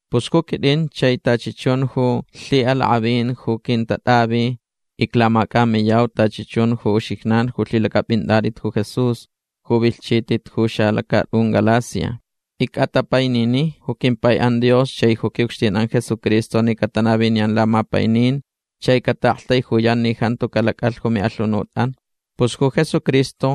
Pus ju quitʼin chai tachi chun ju lhiʼalakʼavin ju quintatʼavi iclamacʼamiyau tachi chun ju uxijnan ju lhilacʼapʼinatʼit ju Jesús ju vilhchitʼit ju xalacatʼun Galacia. Icʼatapainini ju quimpaiʼan Dios chai ju quiʼucxtinʼan Jesucristo ni catanaviniyan lamapainin chai cataʼaktaijuyan ni jantu calacʼalh ju miʼalhunutʼan. Pus ju Jesucristo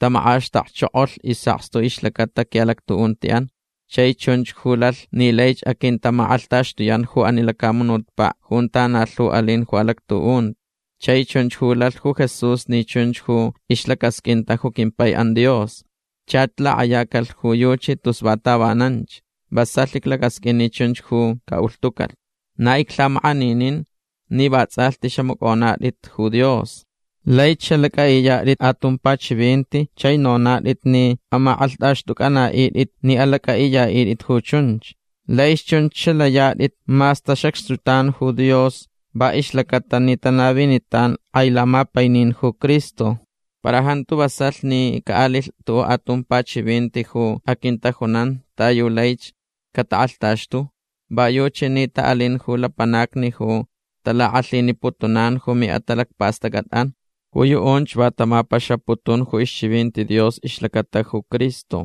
tamakʼaxtakchokolh isʼakstu ixlacata quiʼalactuʼuntiʼan. Chai chunch ju lalh ni laich aquintamakʼalhtaxtuyan ju ani lacamunutpaʼ junta na lhu alin ju alactuʼunti. Chai chunch ju lalh ju Jesús ni chunch ju ixlacasqʼuinta ju quimpaiʼan Dios. Chach lakʼayacalhch ju yuchi tus va tavananch. Vasalh iclacasqʼuin ni chunch ju caʼulhtucalh. Na iclhamakʼaninin ni vatsʼalhti xamacʼonatʼit ju Dios. Laich xalacʼaʼiyatʼit atumpa chivinti chai nonatʼit ni amakʼalhtʼaxtʼucʼanaʼitʼit ni alacʼaʼiyaʼitʼit ju chunch. Laich chunch xalayatʼit mas tasacxtutan ju Dios va ixlacaʼatalh ni tanavinitan kʼai lamapainin ju Cristo. Para jantu vasalh ni caʼalilh tuʼuʼ atumpa chivinti ju aquintajunan ta yu laich catakʼalhtaxtu. Va yuchi ni taʼalin ju lapanacni ju talakʼalhiniputunan ju miʼatalacpastʼacʼatʼan. Ju yuʼunch va tamapaxaputun ju ixchivinti Dios ixlacata ju Cristo.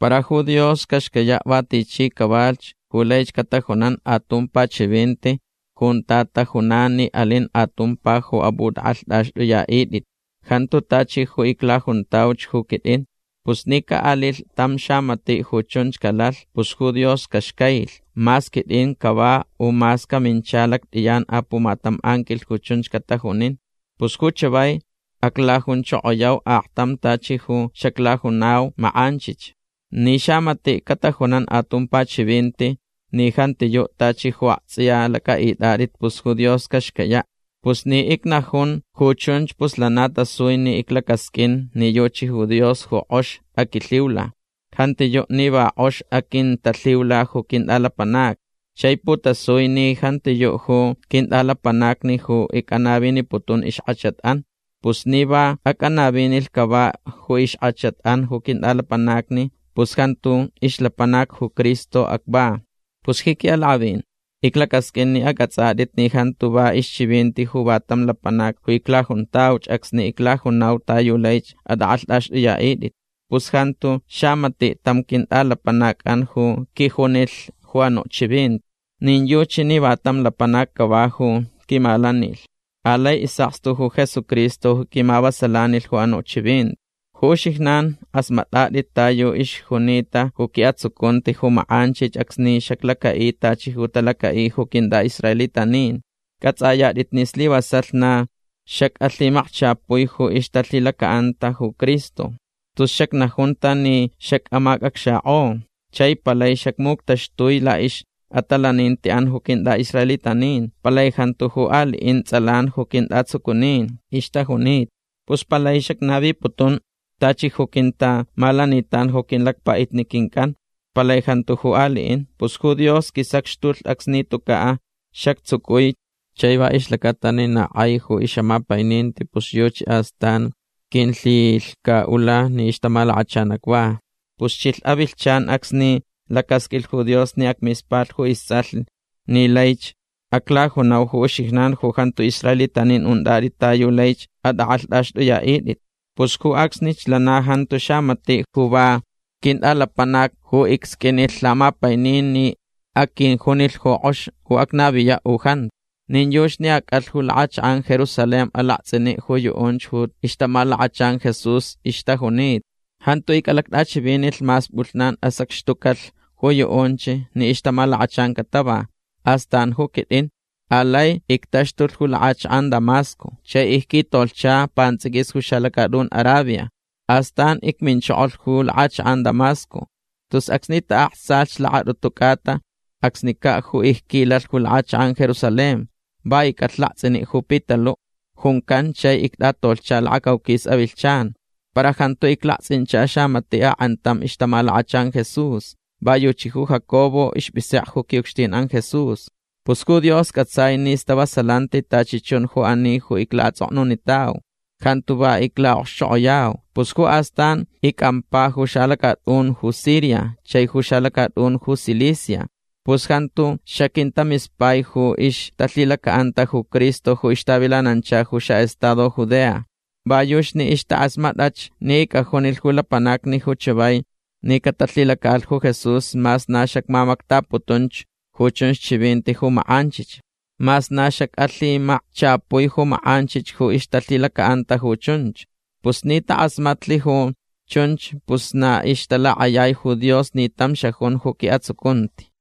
Para ju Dios caxcayaʼ va tichi cavalhch ju laich catajunan atumpa chivinti junta tajunan ni alin atumpa ju apʼutʼakʼalhtʼaxtʼuyaʼitʼit. Jantiyuʼ tachi ju iclajuntauch ju quitʼin. Pus ni caʼalilh tam xamatiʼ ju chunch calalh pus ju Dios caxcailh. Mas quitʼin cava u mas camincha lactʼiyan pumatam anquilh ju chunch catajunin. Pus ju chavai aclajunchokoyau aktam tachi ju xaclajunau makʼanchich. Ni xamatiʼ catajunan atumpa chivinti ni jantiyuʼ tachi ju aktsʼiya lacʼaʼitʼatʼit pus ju Dios caxcayaʼ. Pus ni icnajun ju chunch pus lana tasui ni iclacasqʼuin ni yuchi ju Dios ju kʼox aquilhiula. Jantiyuʼ ni va kʼox aquintalhiula ju quintʼalapanacni. Chai putasui ni jantiyuʼ ju quintʼalapanacni ju icʼanaviniputun ixkʼachatʼan. Pus ni va acʼanavinilh cava ju ixkʼachatʼan ju quintʼalapanacni pus jantu ixlapanac ju Cristo acva. Pus ji quiʼalakʼavin iclacasqʼuin ni acʼatsʼatʼit ni jantu va ixchivinti ju va tam lapanac ju iclajuntauch acsni iclajuntau ta yu laich atʼakʼalhtʼaxtʼuyaʼitʼit. Pus jantu xamatiʼ tam quintʼalapanacʼan ju quijunilh ju anuʼ chivinti. Nin yuchi ni va tam lapanac cava ju quimalanilh. Alai isʼakstu ju Jesucristo ju quimavasalanilh ju anuʼ chivinti. Ju uxijnan kʼasmatʼatʼit ta yu ixjunita ju quiʼatsucunti ju makʼanchich acsni xaclacaʼi tachi ju talacaʼi ju quintʼaʼisraelitanin. Cʼatsʼayatʼit ni slivasalh na xacʼalhimakchapui ju ixtalhilacaʼanta ju Cristo. Tus xacnajunta ni xacʼamaknikʼo. Chai palai xacmuctaxtui laʼixʼatalanintiʼan ju quintʼaʼisraelitanin. Palai jantu ju aliʼin tsʼalan ju quintʼatsucunin ixtajunita. Pus palai xacnaviputun tachi ju quintamalanitan ju quilacpaʼitni quincʼan. Palai jantu ju aliʼin. Pus ju Dios quisacxtulh acsni tucaʼ xactsucui. Chai va ixlacata ni na kʼai ju ixʼamapaininti pus yuchi astan quilhilhcaʼula ni ixtamalakachan acva. Pus chilh avilhchan acsni lacasqʼuilh ju Dios ni acmispalh ju istsʼalh ni laich aclajunau ju uxijnan ju jantu israelitanin untʼatʼit ta yu laich atʼakʼalhtʼaxtʼuyaʼitʼit. Pus ju acsnich lana jantu xamatiʼ ju va quintʼalapanac ju icsqʼuinilh lamapainin ni aquijunilh ni kʼox ju acnaviyaʼ u jantu. Nin yuchi ni acʼalh ju lakʼachakʼan Jerusalén alaktsʼiniʼ ju yuʼunch ju ixtamalakachan Jesús ixtajunita. Jantu icʼalactʼachivinilh mas pʼulhnan asacxtucalh ju yuʼunch ni ixtamalakachan catava. Astan ju quitʼin. Alai ictaxtulh ju lakʼachakʼan Damasco. Chai icquitolhcha pantsʼiquis ju xalacatʼun Arabia. Astan icminchokolh ju lakʼachakʼan Damasco. Tus acsni taʼaktsalh lakatʼutu cʼata acsnicaʼ ju icquilalh ju lakʼachakʼan Jerusalén. Va icʼalh laktsʼiniʼ ju Pitaluʼ juncan chai ictʼatolhcha lakacauquis avilhchan. Para jantu iclaktsʼincha xamatiʼ akʼantam ixtamalakachan Jesús. Va yuchi ju Jacobo ispʼisekʼe ju quiʼucxtinʼan Jesús. Pus Dios cʼatsai ni stavasalanti tachi chun ju ani ju iclaʼatsʼoknunitau. Jantu va iclaʼokxchokʼoyau. Pus ju astan icʼampa ju xalacatʼun ju Siria chai ju xalacatʼun ju Cilicia. Pus jantu xaquintamispai ju ixtalhilacaʼanta ju Cristo ju ixtavilanancha ju xaʼestado Judea. Va yuchi ni ixtakʼasmatʼach ni icʼajunilh ju lapanacni ju chavai ni catalhilacaʼalh ju Jesús mas na xacmamactaputunch ju chunch chivinti ju makʼanchich. Mas na xacʼalhimakchapui ju makʼanchich ju ixtalhilacaʼanta ju chunch. Pus ni takʼasmatlh ju chunch pus na ixtalakʼayai ju Dios ni tam xajun ju quiʼatsucunti.